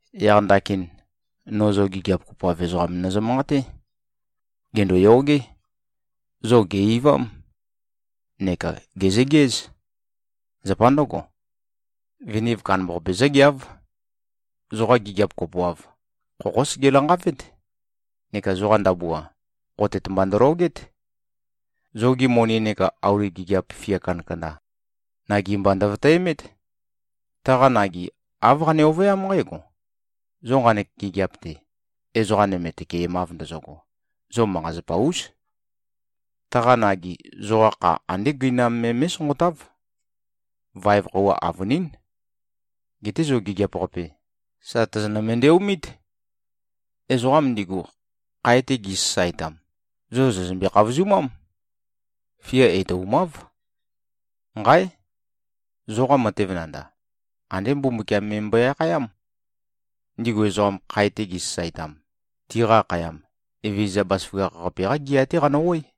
Yaq ndakin, no zo gigiap kopoav ezoqam nøzø-manqaté. Gèndoyogé. Zo gè-eivám neka gèzøgeǽz. Zapa ndǿgo, viniv kandambaqape zǿgeáv. Zoqa gigiap kopoav, khokhó sege-lanqavét neka zoqa ndabua, khotet mba ndølogét. Zogi moni neka auli gigiap fia kandakanda, nagi mba ndøvøtæmét. Taqa nagi, āv qane-ovøyám nqǽgo: Zo nqanek gigiap-te ezoqa nøme tøkemav ndøgo, zo manqa-zapa-ús. Taqa nagi zoqa kha andé gøinam me mé꞉sonqotáv. Vaev khøuwa avønín. Geté zo gigiap-qape, sà tozonø-mendeomít. Ezoqam ndigu, khae-te gizø-sasaetam, zo zòzømbe-khavozumám. Fia etoumáv. Nqáe! Zoqa matev nandav, andé Mbumbukiam me mbøe-akhayám. Ndigu ezoqam, khae-te gizø-sasaetam, tiqa akhayam, Evezøza Bazaføgakh-qape-qá gea-té qanø-oé.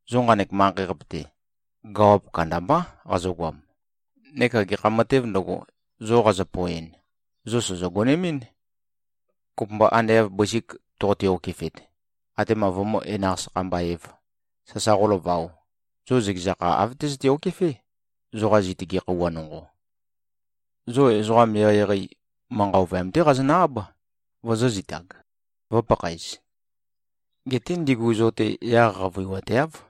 Zo nqanek manqei-qape-te, gawap kandambá qazøgoam, neka gekha matēv ndøgo, zo qazø-poeɨn, zo sòzo-gonemɨ́n. Kopømba ande av bøsik toqote-okefet, atema vømǿ-enaq-sakha-mba-ēv, sasa qólavaō, zo zøkeza kha āv tøzøte-okefé, zoqa zitøge khøuwa nonqo. Zo ezoqam eqeieqei, manqa ovøyam-té qazonø-áb, vozōzitag, vø̄pakhaez. Geté ndigu zo-te yaq qavøiwateáv.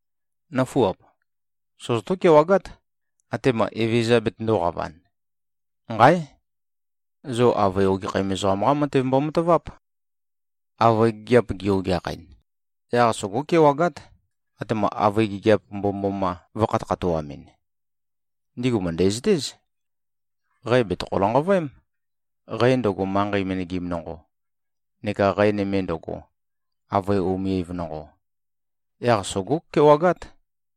Nǿfuap! Sozotó-kewagát, atema Evezøza betøndōqavan. Nqáe! Zo avøe ogekhæm ezoqam-qa matev mbomataváp. Avøe gigiap gi-ogeakhɨn, yaq sogó-kewagát, atema avøe gigiap mbomømboma vø̄khatøkhatoamɨn. Ndigu mø̀ndæzøtéz. Qæ bètøkhæ-lanqavøém, qæ ndøgo, manqei menegim nonqo, neka qæ nøme ndøgo, avøe umivøem nonqo. Yaq sogó-kewagát.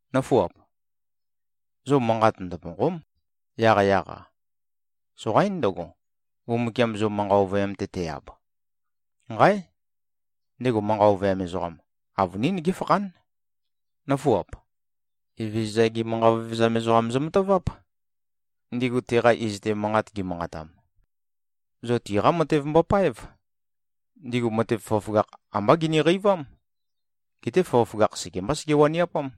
Nǿfuap! Zo manqa ndøpònqo᷄m, yaqyaq-a. Soqaín ndøgo, Mbumbukiam zo manqa ovøyam-te te-ab. Nqáe! Ndego manqa ovøyam ezoqam, avønín géfakhán. Nǿfuap! Evezøza-gi manqa vevezam ezoqam zømataváp, ndigu teqa iz-te, manqat gimanqatam. Zo tiqá matev mbopáev. Ndigu matev føgøføgakh ambá giniqeivám. Geté føgøføgakh sekembá sege-waniapám.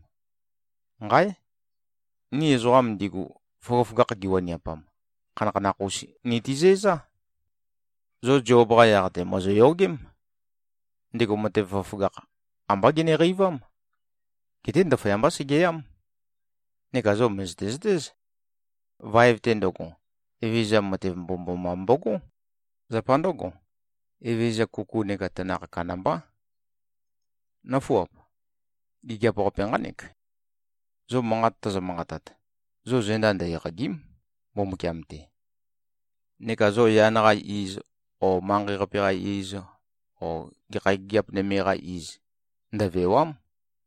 Nqáe! Ni ezoqam ndigu, føgøføgakh giwaniapam, khanakhanakh-us nitizæzá. Zo Zob-qa yaq-te, mòzoyogém. Ndego matev føgøføgakh, ambá geneqeivám. Geté ndaføyambá segeyám. Neka zo mø̀zøte-zøtéz: Vaev-te ndøgo, Evezøza matev mbomømboma mbogó. Zapa ndǿgo, Evezøza kuku neka tanakh kandambá. Nǿfuap! Gigiap-qape nqánek: Zo manqat tozo-manqatat, zo zenda ndø-eqàgi᷄m, Mbumbukiam-te. Neka zo yan-qa iz o manqei-qape-qa iz o gekha gigiap nøme-qa iz, ndøvèwa᷄m,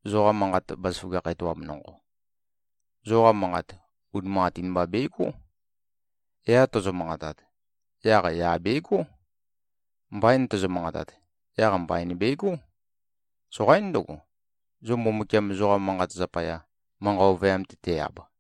zoqa manqat bazaføgakh etoam nonqo. Zoqa manqat, unimanqatin mba begó. “Ya” tozo-manqatat, yaq “ya” begó. “Mbain” tozo-manqatat, yaq “mbain” begó. Soqaín ndøgo, zo Mbumbukiam, zoqa manqat zapaya, manqa ovøyam-te te-ab.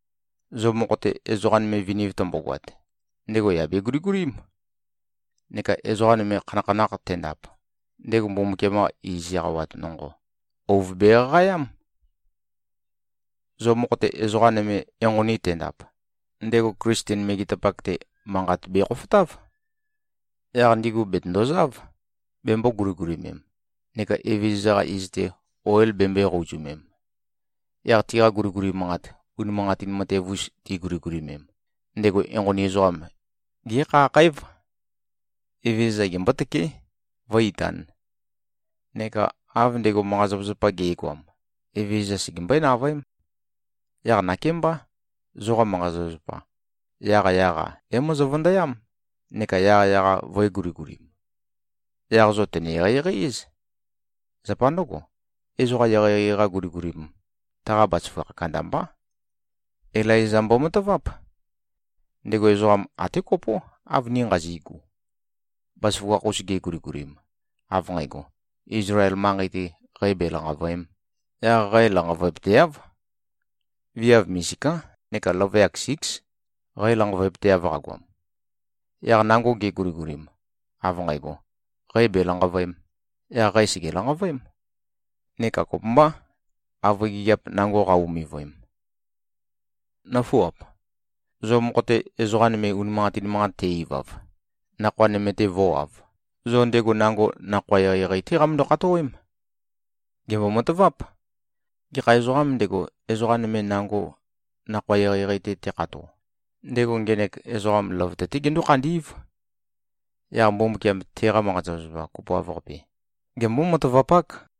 Zo mokho-te, ezoqa nøme viniv tømbogoat, ndego yà beguligulím. Neka ezoqa nøme, khanakhanakh tendap, ndego Mbumbukiam-qa iz eqawat nonqo, ouv beqaqaeám. Zo mokho-te, ezoqa nøme enqoni tendap, ndego Klisten megetapak-te, manqat bekhofotáv. Yaq ndigu bètøndozáv, bembō-guligulimem, neka Evezøza-qa iz-te, oil bembøē-qouzumem. Yaq tiqa guliguli manqat, unimanqatin matev-us tiguligulimem, ndego enqoni ezoqam, gékhakhǽv. Evezøza gembótøké, vǿ-itān. Neka av ndego manqa-zapazapa ge꞉goam, Evezøza segembøé-navøém. Yaq nakémbá, zoqa manqa-zapazapa, yaqyaq-a é-mozo-vøndøyám, neka yaqyaq-a vø̄e-guligulim. Yaq zo tø̀ne-eqeieqei-éz. Zapa ndǿgo, ezoqa eqeieqei-qa guligulim, taqa bazaføgakh kandambá. Ilaiza mbovatáp. Ndego ezoqam até kopó, av ni nqazi꞉gu. Bazaføgakh-us geguligulim, av nqægo, Izlael manqei-te qæ belanqàvøe᷄m, yaq qæ lanqavøepøteáv. Viav misiká neka løvøyak síks, qæ lanqavøepøteav qagoam. Yaq nango geguligulim, av nqægo, qæ bèlanqavøēm, yaq qæ sège-lanqavøém, neka kopømbá, avøe gigiap nango qa-umivøem. Nǿfuap! Zo mokho-te, ezoqa nøme unimanqatin manqat te-ivav, nakhoa nøme-te vǿwāv, zo ndego nango nakhoa eqeieqei-té qamøndo-khatowém. Gèmbo-mataváp: Gekha ezoqām ndego, ezoqa nøme, nango nakhoa eqeieqei-te tekhato, ndego ngenek ezoqam løvøte-té gendó-khandí꞉v. Yaq Mbumbukiam teqa manqa-zapazapa kopoav-qape, gembó-matavapák.